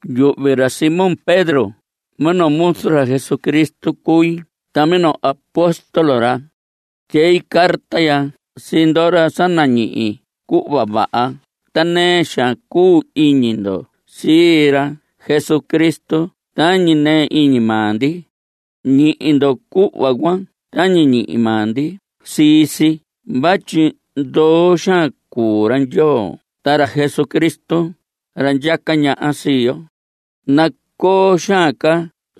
Yuhvi ra Simón Pedro, minoo muzu ra Jesucristo cui ta minoo apóstol ra. Tyei carta ya sii ndoho ra sa nañihi cuhva vaha ta nɨɨ xaan cuu iñi ndo sii ra Jesucristo tañi nɨɨ iñi maa ndi. Ñihi ndo cuhva cuan tañi ñihi maa ndi sii si vatyi ndoo xaan cuu ra Ndyoo ta ra Jesucristo, ra ndyaca ñaha sii yo. Nacoo xaan ca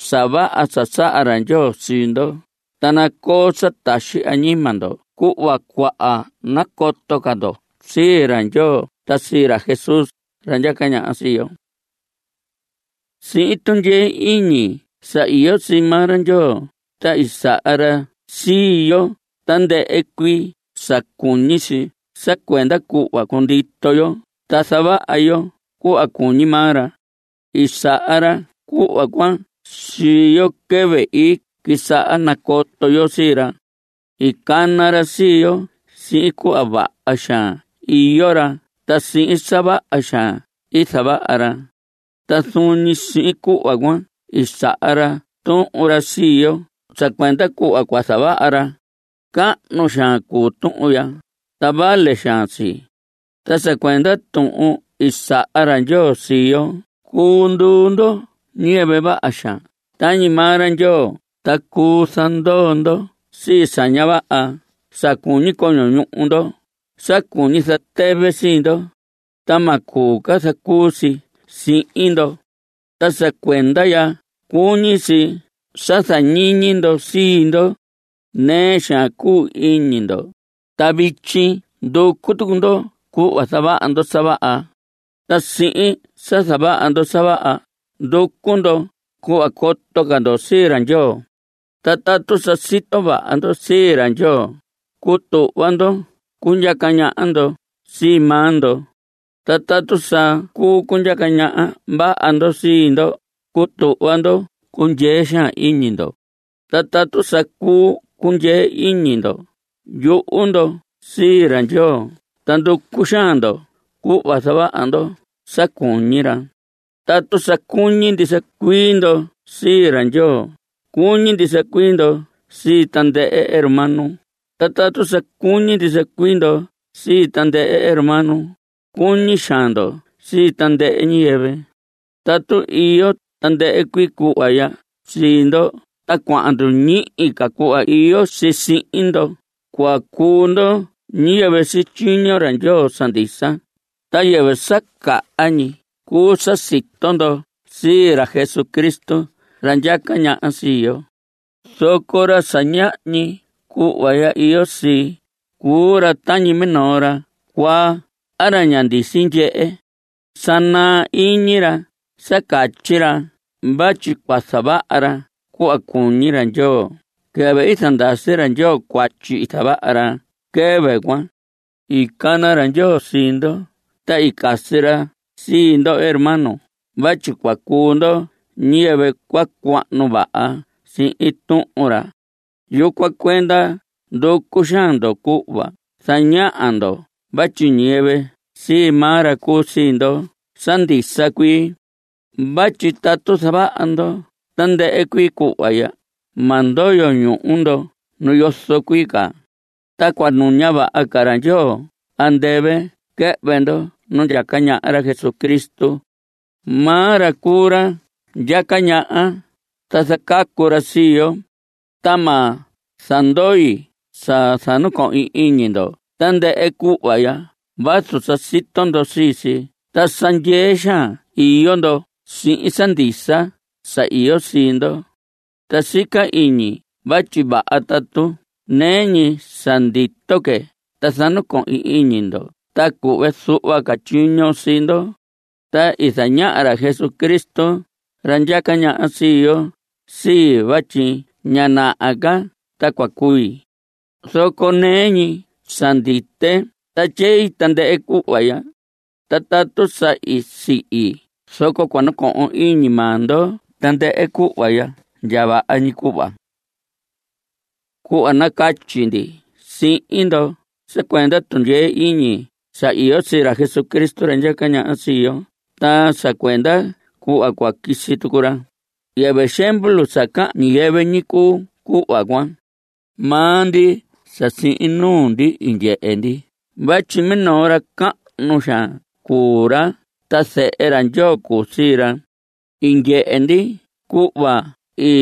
sa vaha sa saha ra Ndyoo sii ndo, ta nacoo sa taxi añima ndo cuhva cuahan nacoto ca ndo sii ra Ndyoo ta sii ra Jesús, ra ndyaca ñaha sii yo. Sihin tundyee iñi sa iyo sii maa ra Ndyoo, ta i saha ra sii yo tandɨhɨ cuii sa cuñi si sa cuenda cuhva cundito yo ta zavaha yo cuhva cuñi maa ra. I saha ra cuhva cuan sii yo quɨvɨ i quisaha nacoto yo sii ra. I cana ra sii yo sihin cuhva vaha xaan iyo ra ta sihin sa vaha xaan i zavaha ra. Ta zuun ñi sihin cuhva cuan i saha ra tuhun ra sii yo sa cuenda cuhva cua zavaha ra. Cahnu xaan cuu tuhun ya, ta vale xaan si. Ta sa cuenda tuhun i saha ra Ndyoo sii yo, cuu nduu ndo ñiyɨvɨ vaha xaan tañi maa ra Ndyoo, ta cuu zandoo ndo sii sa ña vaha sa cuñi coño ñuhu ndo, sa cuñi zatɨvɨ sii ndo. Ta ma cuu ca zacuu si sihin ndo. Ta sa cuenda ya cuñi si sa zañiñi ndo sii ndo. Nɨɨ xaan cuu iñi ndo, ta vityi nducu tucu ndo cuhva zavaha ndo sa vaha. Ta sihin sa zavaha ndo sa vaha, nducu ndo cuhva coto ca ndo sii ra Ndyoo. Ta tatu sa sito vaha ndo sii ra Ndyoo, cutuhva ndo cundyaca ñaha ndo sii maa ndo. Ta tatu sa cuu cundyaca ñaha vaha ndo sii ndo, cutuhva ndo cundyee xaan iñi ndo. Ta tatu sa cuu cundyee iñi ndo, yuhu ndo sii ra Ndyoo ta nducu xaan ndo cuhva zavaha ndo sa cuñi ra. Tatu sa cuñi ndisa cuii ndo sii ra Ndyoo, cuñi ndisa cuii ndo sii tandɨhɨ hermano, ta tatu sa cuñi ndisa cuii ndo sii tandɨhɨ hermano, cuñi xaan ndo sii tandɨhɨ ñiyɨvɨ. Tatu iyo tandɨhɨ cuii cuhva ya sii ndo ta cuahan nduñihi ca cuhva iyo si sihin ndo, cua cuu ndo ñiyɨvɨ sityiño ra Ndyoo sa ndisa, ta yɨvɨ sa caha ñi cuu sa sito ndo sii ra Jesucristo, ra ndyaca ñaha sii yo. Zoco ra sa ñahñi cuhva ya iyo sii, cuu ra tañi minoo ra cuaa a ra ña ndisi ndyehe. Sa naa iñi ra sa catyi ra vatyi cua zavaha ra cuhva cuñi ra Ndyoo quɨvɨ i zandasi ra Ndyoo cuatyi i zavaha ra quɨvɨ cuan. I cana ra Ndyoo sii ndo ta i casi ra sii ndo hermanos vatyi cua cuu ndo ñiyɨvɨ cua cuahnu vaha sihin Tuhun ra. Yucuan cuenda nducu xaan ndo cuhva zañaha ndo vatyi ñiyɨvɨ sii maa ra cuu sii ndo sa ndisa cuii. Vatyi tatu zavaha ndo tandɨhɨ cuii cuhva ya, ma ndoyo ñuhu ndo nu yozo cuii ca. Ta cua nuña vaha ra Ndyoo andɨvɨ quɨhvɨ ndo nu ndyaca ñaha ra Jesucristo. Maa ra cuu ra ndyaca ñaha, ta zacacu ra sii yo. Ta ma zandoi sa zanacohin iñi ndo tandɨhɨ cuhva ya vazu sa sito ndo sii si ta sa ndyee xaan iyo ndo sihin sa ndisa sa iyo sii ndo. Ta sica iñi vatyi vaha tatu nɨɨ ñi sa ndito que ta zanacohin iñi ndo ta cuhve zuhva tyiño sii ndo. Sa i zañaha ra Jesucristo, ra ndyaca ñaha sii yo, sii vatyi ña naha ca ta cua cui. Zoco nɨɨ ñi sa ndite ta tyei tandɨhɨ cuhva ya, ta tatu sa sihi zoco cua nacohon iñi maa ndo tandɨhɨ cuhva ya ndya vaha ñi cuhva. Cuhva i nacatyi ndi sihin ndo sa cuenda tundyee iñi sa iyo sii ra Jesucristo, ra ndyaca ñaha sii yo ta sa cuenda cuhva cua quisi tucu ra, yɨvɨ xemvlu sa cahan ñiyɨvɨ ñi cuu cuhva cuan. Maa ndi sa sihin nuu ndi i ndyehe ndi vatyi minoo ra cahnu xaan cuu ra ta zehe ra Ndyoo cuu sii ra. I ndyehe ndi cuhva i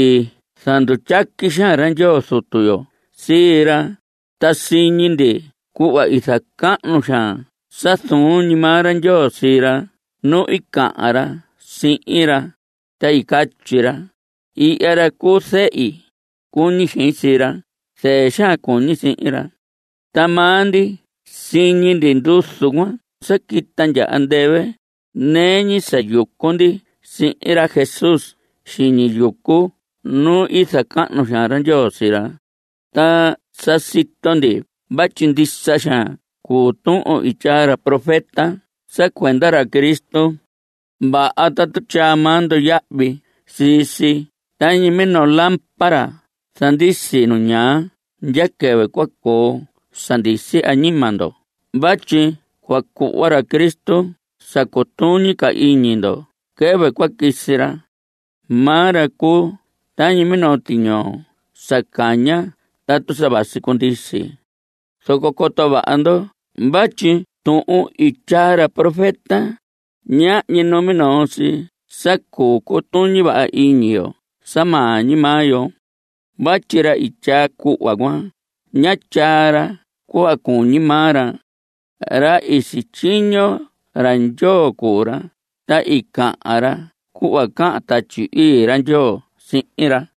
zandutyaqui xaan ra Ndyoo Zutu yo sii ra, ta siñi ndi cuhva i zacahnu xaan sa zuun ñi maa ra Ndyoo sii ra nu i cahan ra sihin ra, ta i catyi ra: “Ihya ra cuu zehi. Cuñi xein sii ra. Zɨɨ xaan cuñi sihin ra.” Ta maa ndi siñi ndi nduzu cuan sa quita andɨvɨ, nɨɨ ñi sa yucu ndi sihin ra Jesús xiñi yucu nu i zacahnu xaan ra Ndyoo sii ra. Ta sa sito ndi vatyi ndisa xaan cuu tuhun i tyaa ra profeta sa cuenda ra Cristo. Vaha tatu tyaa maa ndo yahvi sii si tañi minoo lámpara zandisi nu ñaa ndya quɨvɨ cua coo sa ndisi añima ndo vatyi cua cuhva ra Cristo sa cutuñi ca iñi ndo quɨvɨ cua quisi ra. Maa ra cuu tañi minoo tiñoo sa caña tatu sa vasi cundisi. Zoco coto vaha ndo vatyi tuhun i tyaa ra profeta, ñahñi numinoo si sa cuu cutuñi vaha iñi yo sa maa ñi maa yo. Vatyi ra i tyaa cuhva cuan, ñá tyaa ra cuhva cuñi ñi maa ra. Ra i sityiño ra Ndyoo cuu ra, ta i cahan ra cuhva cahan Tatyi Ii ra Ndyoo sihin ra.